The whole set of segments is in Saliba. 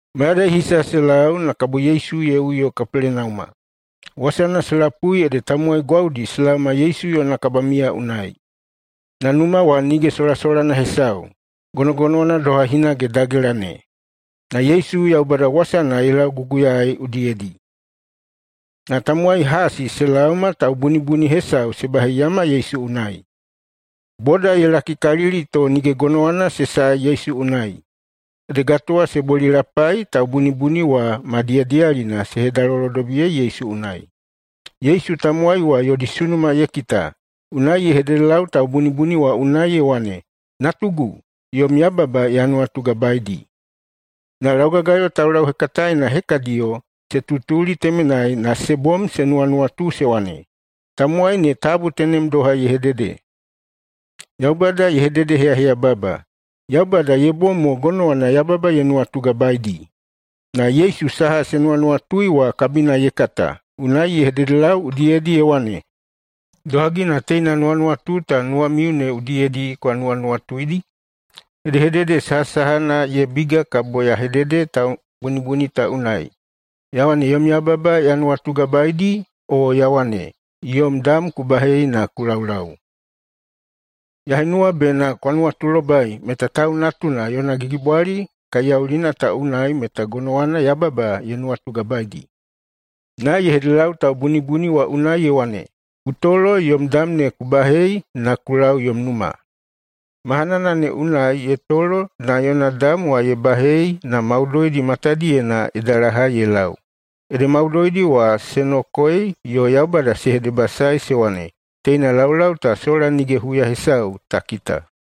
Mayadai hisa se lau, na kabo Yesu ye uyo Kapelenauma. Wasana se lapui ede tamowai gwaudi se laoma Yesu yona kabamiya unai. Na numa wa nige solasolana hesau, gonogonowana doha hinage dagela ne. Na Yesu Yaubada wasana ye lauguguyai udiyedi. Na tamowai hasi se laoma taubunibuni hesau se baheiyama Yesu unai. Boda ye lakikalili to nige gonowana se sae Yesu unai. Ede gatowa se bolilapai na taubunibuni wa ma diyadiyalina se hedalolodobiyei Yesu unai. Yesu tamowai wa yodi sunuma ye kita, unai ye hededelau taubunibuni wa unai ye wane, “Natugu, yom yababa ya nuwatugabaeidi.” Na laugagayo taulauhekataena hekadiyo se tutuli temenai na se bom se nuwanuwatu se wane, “Tamowai ne tabu tenem doha ye hedehedede! Yaubada ye hededeheyaheyababa! Yaubada ye bom mo gonowana yababa ye nuwatugabaeidi!” Na Yesu saha se nuwanuwatui wa kabina ye kata, unai ye hededelau udiyedi ye wane, “Idohagi na teina nuwanuwatu ta nuwamiu ne udiyedi kwa nuwanuwatuidi? Hedehedede sahasahana ye biga kabo ya hedede taubunibuni ta unai, ya wane, ‘Yom yababa ya nuwatugabaeidi’, o ya wane, ‘Yom dam ku bahei na ku laulau’? Ya henuwa bena kwa nuwatulobai meta Tau Natuna yona gigibwali kaiyaulina ta unai meta gonowana yababa ye nuwatugabaedi.” Na ye hededelau taubunibuni wa unai ye wane, “Ku tolo, yom dam ne ku bahei na ku lau yom numa.” Mahanana ne unai ye tolo na yona dam wa ye bahei na maudoidi matadiyena ye dalahai ye lau. Ede maudoidi wa se nokoei yo Yaubada se hedebasaei se wane, “Teina laulau ta sola nige huya hesau ta kita!”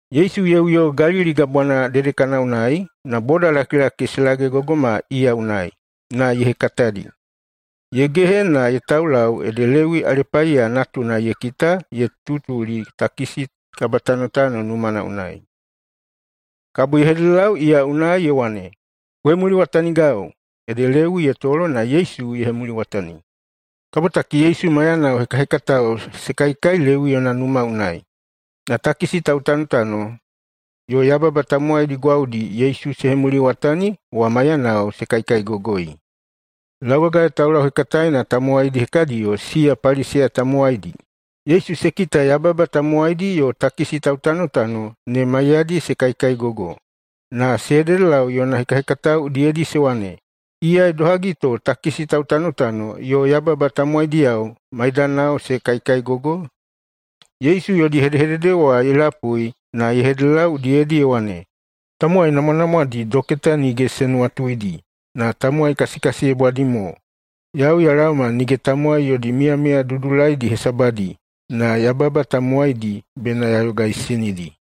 Yesu ye uyo Galili Gabwana dedekana unai, na bodalakilaki se lagegogoma iya unai, na ye hekatadi. Ye gehe na ye taulau ede Lewi Alepaiya natuna ye kita ye tutuli takisi kabatanotano numana unai. Kabo ye hededelau iya unai ye wane, “Ku hemuliwatanigau!” Ede Lewi ye tolo na Yesu ye hemuliwatani. Kabotaki Yesu maiyana hekahekatao se kaikai Lewi yona numa unai. Na takisi tautanotano yo yababa tamowaidi gwaudi Yesu se hemuliwatani wa maiyanao se kaikaigogoi. Laugagayo taulauhekataena tamowaidi hekadiyo, siya Paliseya tamowaidi, Yesu se kita yababa tamowaidi yo takisi tautanotano ne maiyadi se kaikaigogo, na se hededelau yona hekahekatao udiyedi se wane, “Iya idohagi to takisi tautanotano yo yababa tamowaidiyao maidanao se kaikaigogoi?” Yesu yodi hedehedede wa ye lapui na ye hededelau udiyedi ye wane, “Tamowai namwanamwadi doketa nige se nuwatuidi, na tamowai kasikasiyebwadi mo. Yau ya laoma nige tamowai yodi miyamiya dudulaidi hesabadi, na yababa tamowaidi bena ya yogaisinidi.”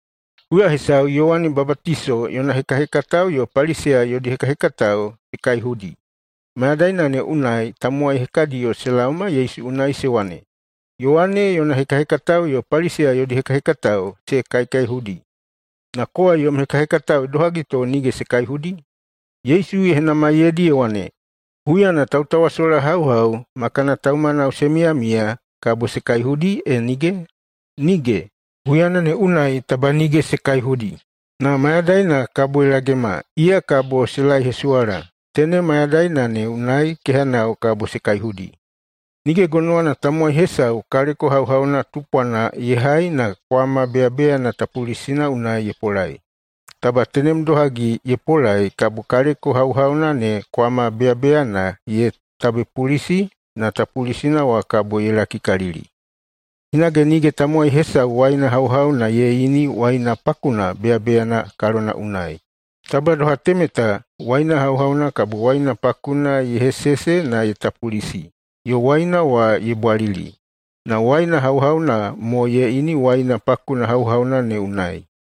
Huya hesau Yowane Babatiso yona hekahekatao yo Paliseya yodi hekahekatao se kaihudi. Mayadaina ne unai tamowai hekadiyo se laoma Yesu unai se wane, “Yowane yona hekahekatao yo Paliseya yodi hekahekatao se kaikaihudi. Na kowa yom hekahekatao idohagi to nige se kaihudi?” Yesu ye henamaiyeidi ye wane, “Huyana tautawasolahauhau ma kana taumanao se miyamiya, kabo se kaihudi e nige? Nige! Huyana ne unai taba nige se kaihudi. Na mayadaina kabo ye lagema, iya kabo se laehesuwala. Tenem mayadaina ne unai kehanao kabo se kaihudi. Nige gonowana tamowai hesau kaleko hauhauna tupwana ye hai na kwama beyabeyana tapulisina unai ye polai. Taba tenemdohagi ye polai, kabo kaleko hauhauna ne kwama beyabeyana ye tabepulisi na tapulisina wa kabo ye lakikalili. Hinage nige tamowai hesau waina hauhauna ye ini waina pakuna beyabeyana kalona unai. Taba doha temeta, waina hauhauna kabo waina pakuna ye hesese na ye tapulisi, yo waina wa ye bwalili. Na waina hauhauna mo ye ini waina pakuna hauhauna ne unai.”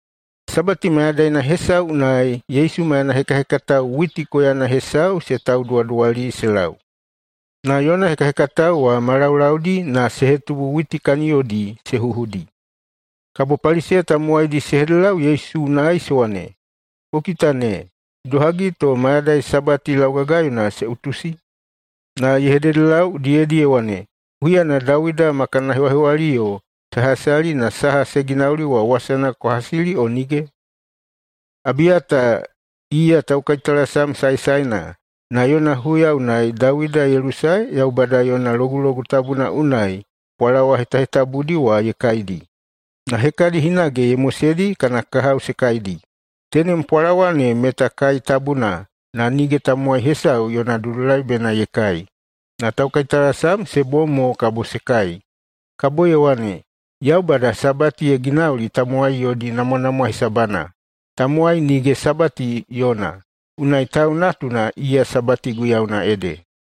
Sabati mayadaina hesau unai Yesu maiyana hekahekatao witi koyana hesau se tauduwaduwali se lau, na yona hekahekatao wa ma laulaudi na se hetubu witi kaniyodi se huhudi. Kabo Paliseya tamowaidi se hededelau Yesu unai se wane, “Ku kita ne! Idohagi to mayadai Sabati laugagayona se utusi?” Na ye hededelau udiyedi ye wane, “Huyana Dawida ma kana hewahewaliyo se hasali na saha ye ginauli wa wasana kwa hasili o nige? Abiyata iya taukaitalasam saesaena, na yona huya unai Dawida ye lusae Yaubada yona Logulogu Tabuna unai pwalawa hetahetabudi wa ye kaidi, na hekadi hinage ye moseidi kana kahao se kaidi. Tenem pwalawa ne meta kai tabuna, na nige tamowai hesau yona dudulai bena ye kai, na taukaitalasam se bom mo kabo se kai.” Kabo ye wane, “Yaubada Sabati ye ginauli tamowai yodi namwanamwa hesabana. Tamowai nige Sabati yona. Unai Tau Natuna iya Sabati guiyauna ede.”